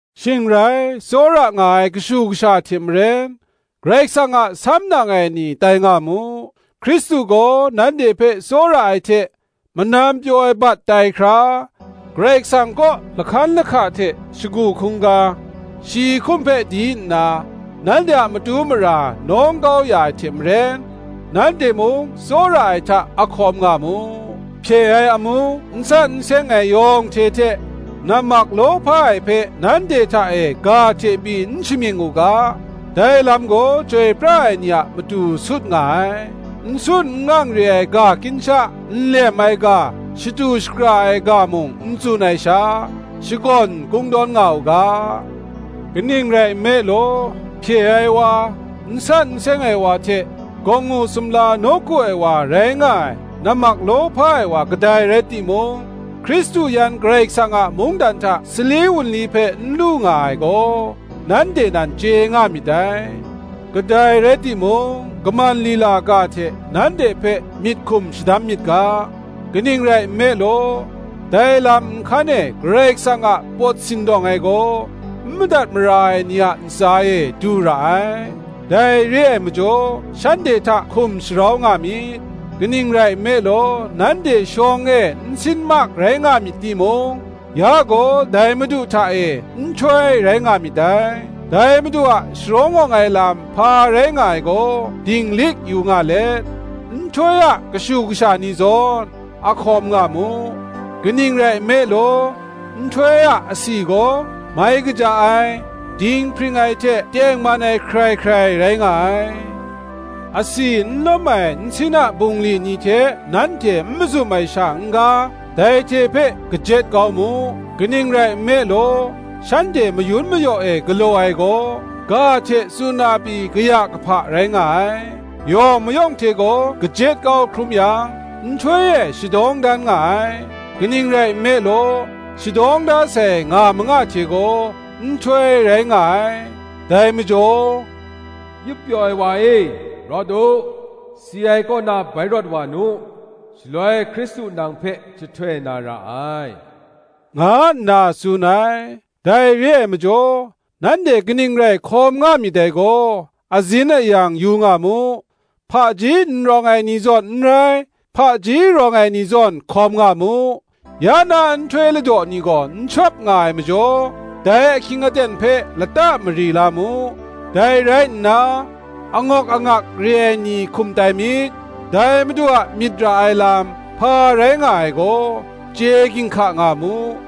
Shing rai, tsawra nga ai kashu kasha hte maren, Karai Kasang a samnang ai ni tai nga mu. Hkristu gaw nanhte hpe tsawra ai hte, manam pyaw ai bat tai hkra, Karai Kasang kaw lahkan lahka hte shagu hkungga, shi hkum hpe di nna, nanhte a matu mara nawng kau ya ai hte maren, nanhte mung tsawra ai hta a hkawm nga mu. Hpye ai amu, n san n seng ai yawng hte hte, nammak lawhpa ai hpe nanhte hta e ga hte pyi n shamying u ga; dai lam gaw chyoi pra ai ni a matu sut nga ai: n sun n ang re ai ga kinsha, nlem ai ga, shatu shakra ai ga mung n tsun ai sha, shakawn kungdawn nga u ga. Kaning rai nme law, hpye ai wa, n san n seng ai wa hte, gawngngu sumla nawku ai wa rai nga ai nammak lawhpa ai wa kadai rai timung, Hkristu yan Karai Kasang a mungdan hta sali wunli hpe n lu nga ai gaw, nanhte nan chye na myit dai. Kadai rai timung, kaman lila ga hte nanhte hpe myit hkum shadam myit ga; kaning rai nme law, dai lam nhkan e Karai Kasang a pawt sindawng ai gaw, n madat mara ai ni a ntsa e du ra ai. Dai re ai majaw shanhte hta hkum sharau nga myit; kaning rai nme law, nanhte shawng e nsin mak rai nga myit timung, ya gaw dai Madu hta e, nhtoi rai nga myit dai. Dai Madu a sharawng awng ai lam hpa rai nga ai gaw, dinglik yu nga let, nhtoi a kashu kasha ni zawn, a hkawm nga mu. Kaning rai nme law, nhtoi a asi gaw mai kaja ai, dinghpring ai hte tengman ai hkrai hkrai rai nga ai. Asi n lawm ai nsin a bungli ni hte nanhte n mazum ai sha n-ga, dai hte hpe kajet kau mu: kaning rai nme law, shanhte mayun mayaw e galaw ai gaw, ga hte tsun na pyi kaya kahpa rai nga ai. Yawng mayawng hte gaw kajet kau hkrum yang, nhtoi e shadawng dan nga ai; kaning rai nme law, shadawng da sai nga manga hte gaw, nhtoi rai nga ai. Dai majaw, Yup pyaw ai wa e, rawt u, Si ai kaw na bai rawt wa nu; Shaloi Hkristu nang hpe jahtoi na ra ai, nga nna tsun ai. Dai re ai majaw, nanhte kaning rai hkawm nga myit dai gaw, azin ayang yu nga mu: hpaji n rawng ai ni zawn n rai, hpaji rawng ai ni zawn hkawm nga mu: ya na nhtoi ladaw ni gaw n shawp nga ai majaw, dai ahkying aten hpe lata mari la mu. Dai rai nna, angawk angak re ai ni hkum tai myit; dai Madu a myit ra ai lam, hpa rai nga ai gaw, chye ginhka nga mu.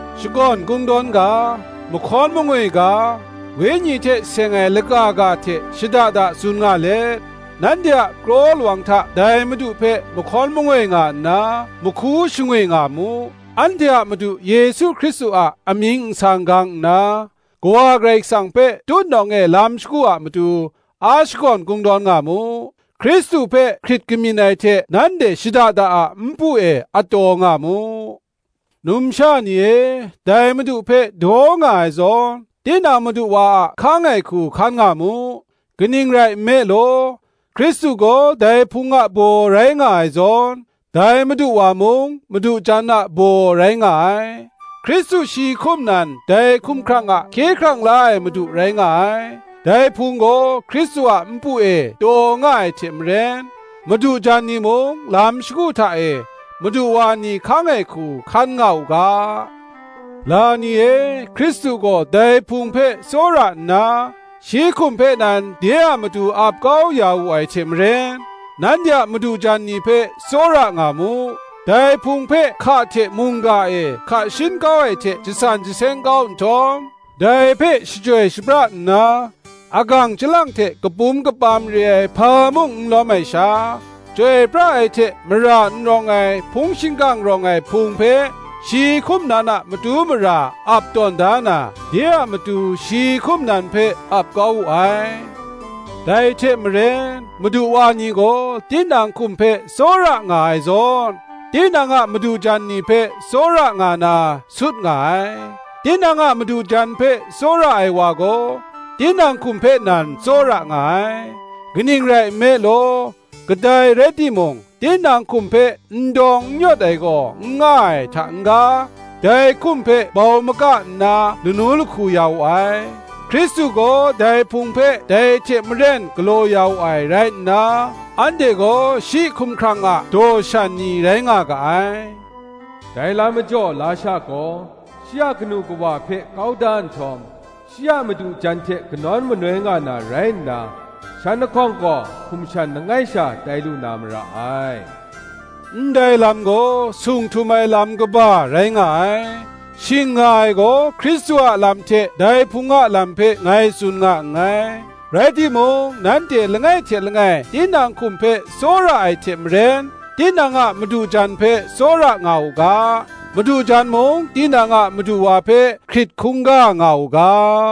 shakawn kungdawn ga, mahkawn mangoi ga, Wenyi hte seng ai laka ga hte shada da tsun nga let, nanhte a kraw lawang hta dai Madu hpe mahkawn mangoi nga nna, mahku shangwi nga mu: anhte a Madu Yesu Hkristu a amying nsang gang nna, Kawa Karai Kasang hpe tutnawng e lam shagu a matu, a shakawn kungdawn nga mu: Hkristu hpe hkrit kamyin ai hte nanhte shada da a npu e a taw nga mu. Numsha ni e, dai Madu hpe daw nga ai zawn, tinang madu wa a hkang ai hku hkan nga mu: kaning rai nme law, Hkristu gaw dai Hpung a baw rai nga ai zawn, dai madu wa mung madu jan a baw rai nga ai: Hkristu shi hkum nan dai hkumhkrang a Hkye hkrang la ai Madu rai nga ai. Dai Hpung gaw Hkristu a npu e taw nga ai hte maren, madu jan ni mung lam shagu hta e madu wa ni hkang ai hku hkan nga u ga. La ni e, Hkristu gaw dai Hpung hpe tsawra nna, shi hkum hpe nan de a matu ap kau ya wu ai hte maren, nanhte a madu jan ni hpe tsawra nga mu. Dai Hpung hpe hka hte mungga e hka shin kau ai hte jasan jaseng kau nhtawm, dai hpe shachyoi shapra nna, agang chyalang hte kapum kapam re ai hpa mung n lawm ai sha, chyoi pra ai hte mara n rawng ai hpung shingkang rawng ai Hpung hpe shi hkum nan a matu mara ap tawn da na, de a matu shi hkum nan hpe ap kau wu ai. Dai hte maren, madu wa ni gaw tinang hkum hpe tsawra nga ai zawn, tinang a madu jan ni hpe tsawra nga na, sut nga ai. Tinang a madu jan hpe tsawra ai wa gaw, tinang hkum hpe nan tsawra nga ai. Kaning rai nme law, kadai rai timung tinang hkum hpe n dawng n yawt ai gaw n nga ai hta n-ga, dai hkum hpe bau maka nna lanu lahku ya wu ai: Hkristu gaw dai Hpung hpe dai hte maren galaw ya wu ai. rai nna, anhte gaw shi hkumhkrang a daw shan ni rai nga ga ai. Dai lam majaw lasha gaw shi a kanu kawa hpe kau da nhtawm, shi a madu jan hte kanawn manoi nga na rai nna, shan lahkawng gaw hkum shan langai sha tai lu na mara ai. Ndai lam gaw sung htum ai lam kaba rai nga ai: shing nga ai gaw Hkristu a lam hte dai Hpung a lam hpe ngai tsun nga nngai. Rai timung, nanhte langai hte langai tinang hkum hpe tsawra ai hte maren tinang a madu jan hpe tsawra nga u ga: madu jan mung tinang a madu wa hpe hkrit hkungga nga u ga.